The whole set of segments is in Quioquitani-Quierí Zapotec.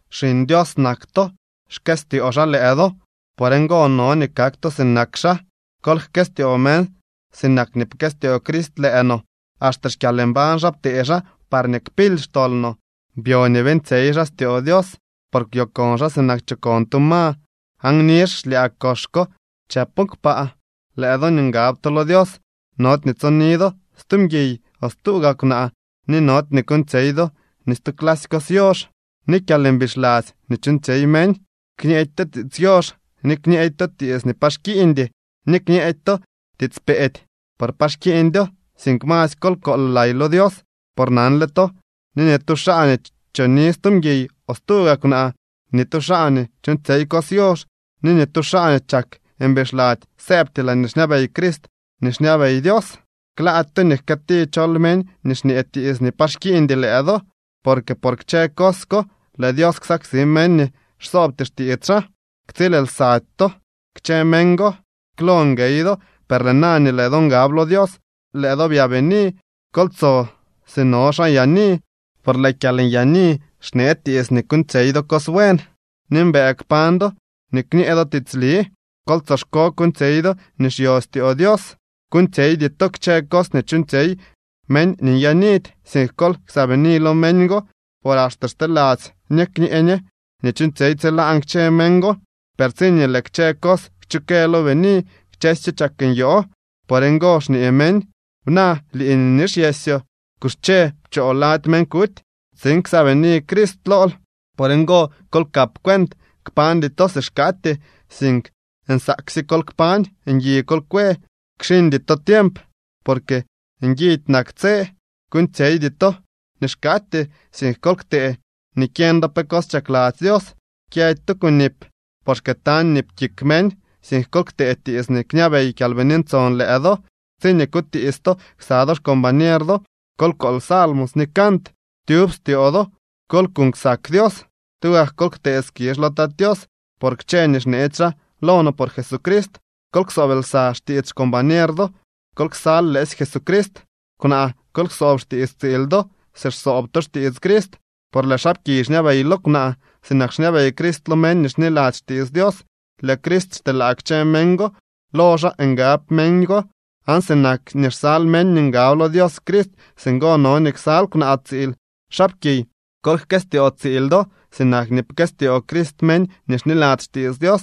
Xiñ Dios nak to. Xkëstyoo xaa lëë do. Por ngo no nii kak to sinak xaa. Kol jkëstyoo meñ sinak nii pkëstyoo Crist lëë no. Axte xkyalmbañ xaa ptee xaa parñee kpily xtol no. Byo nii beeñtsyey xaa styoo Dios por kwyokon xaa sinak chokon tu ma aan nizh xlyaa kox ko chëpo kpaa. Lëë do nii ngab to lo Dios, nody nii tsoni do stu mguiy o stu gaa kwnaa, ni nody nii kuuñtsyey do ni stu clasy cos yox ni kyalmbixladzy nii chuuñtsyey meñ. Kñeedy to tiits yox, ni kñeedy to tiits nii pa xkiiñdy, ni kñeedy to tiits peedy, por pa xkiiñdyo, sink masy kol kool lay lo Dios. Por nanle to nii ni tu xaa nii choni stu mguiy o stu gaa kwnaa, ni ni tu xaa nii chuuñtsyey cos yox, ni ni tu xaa nii chak mbixladzy, sëëbty laañee xñabey Crist ni xñabey Dios. Klaady to nii jkëëti chol meñ nii xñee tiits nii pa xkiiñdy lëë do, porque por kchë cos ko lëë Dios ksaksi meñ nii xsoobty xtiits xaa. Ktsiil lsady to kchë meñ go. Klo nguey do, per lëë na nii lëë do ngab lo Dios, lëë do byaabini. Kol tso si no xaa nyaani, por lëë kyalnyaani xnee tiits nii kuuñtsyey do cos buen, ni mbëë kpañ do ni kñee do tiitsli. Kol tsoxko kuuñtsyey do nii xyostyoo Dios. Kuuñtsyeydy to kchë cos nii chuuñtsyey meñ nii nyaanidy, sink kol ksaabini lo meñ go. Por axte xteladzy ñe kñee ñe nii chuuñtsyey tsilaan kchë meñ go, per tsiñee lëë kchë cos xchukë lo bini, kchësyo chak nyoo. Por ngo xñee meñ: Bna, lii nii nixyesyoo. Kuxche, pchoo lady meñ kuty, tsiin ksaabini Crist lool. Por ngo, kol kap cuent. Kpañdy to si xkaatyee, sink nsaaksye kol kpañ. Ngui kol kwe, kxiñdy to tiemp, porque nguidy nak tse. Kuuñtsyeydy to nii xkaatyee, sink kol ktee nii kyeñ do pe cos chakladzy Dios. Kyëdy to kunip, por xkëëtañ nip kik meñ. Sink kol ktee tiits nii kñabey Kyalbini Ntson lëë do. Tsiñee kutiits to ksa do xcombañer do, kol kool salmos ni cant. Tyub styoo do kol kuuñ ksak Dios. Tugak kol ktee skizh lo Tat Tios por kchë nii xneetsy xaa lo no por Jesucrist. Kol ksoob lsa xtiits xcombañer do, kol ksal lëësy Jesucrist. Kwnaa, kol ksoob xtiits tsiil do si xsoob to xtiits Crist. Por lëë xaapkiy xñabey lo kwnaa, sinak xñabey Crist lo meñ nii xniladzy xtiits Dios. Lëë Crist xteelaa kchë meñ go. Lo xaa ngab meñ go. Aan sinak nii xsal meñ nii ngab lo Dios Crist, singo no nii ksal kwnaa tsiil. Xaapkiy, kol jkëstyoo tsiil do, sinak nii pkëstyoo Crist meñ nii xniladzy xtiits Dios,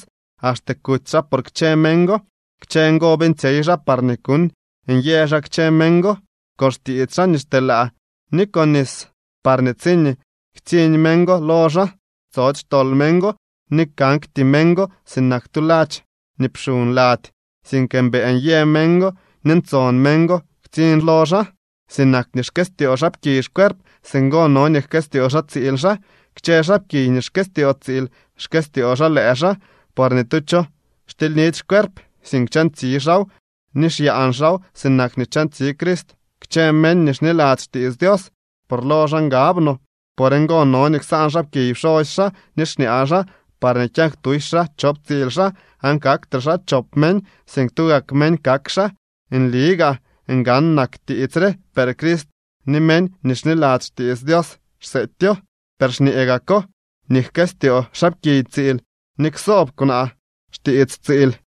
axte kuty xaa por kchë meñ go. Kchë ngo beeñtsyey xaa parñee kuuñ nyë xaa kchë meñ go con xtiits xaa nii xteelaa ni con nis, parñee tsiñee ktsiñ meñ go lo xaa, tsody xtol meñ go. Ni kakty meñ go sinak tu ladx nii pxuñ lady, sink mbëë nyë meñ go ni ntson meñ go ktsiñ lo xaa. Sinak nii xkëstyoo xaapkiy xcuerp, singo no nii jkëstyoo xaa tsiil xaa. Kchë xaapkiy nii xkëstyoo tsiil xkëstyoo xaa lëë xaa. Por ni tu cho xtilynidy xcuerp, sink chantsi xaaw ni xyaan xaaw sinak nii chantsi Crist kchë meñ nii xniladzy xtiits Dios, por lo xaa ngab no. “Por ngo no nii ksaan xaapkiy pxosy xaa ni xñaa xaa, parñee kyak tusy xaa chop tsiil xaa, aan kaktre xaa chop meñ, sink tugak meñ kak xaa.” Nli gaa ngan nak tiits re, per Crist ni meñ nii xniladzy xtiits Dios xseetyo. Per xñee gako nii jkëstyoo xaapkiy tsiil, ni ksoob kwnaa xtiits tsiil.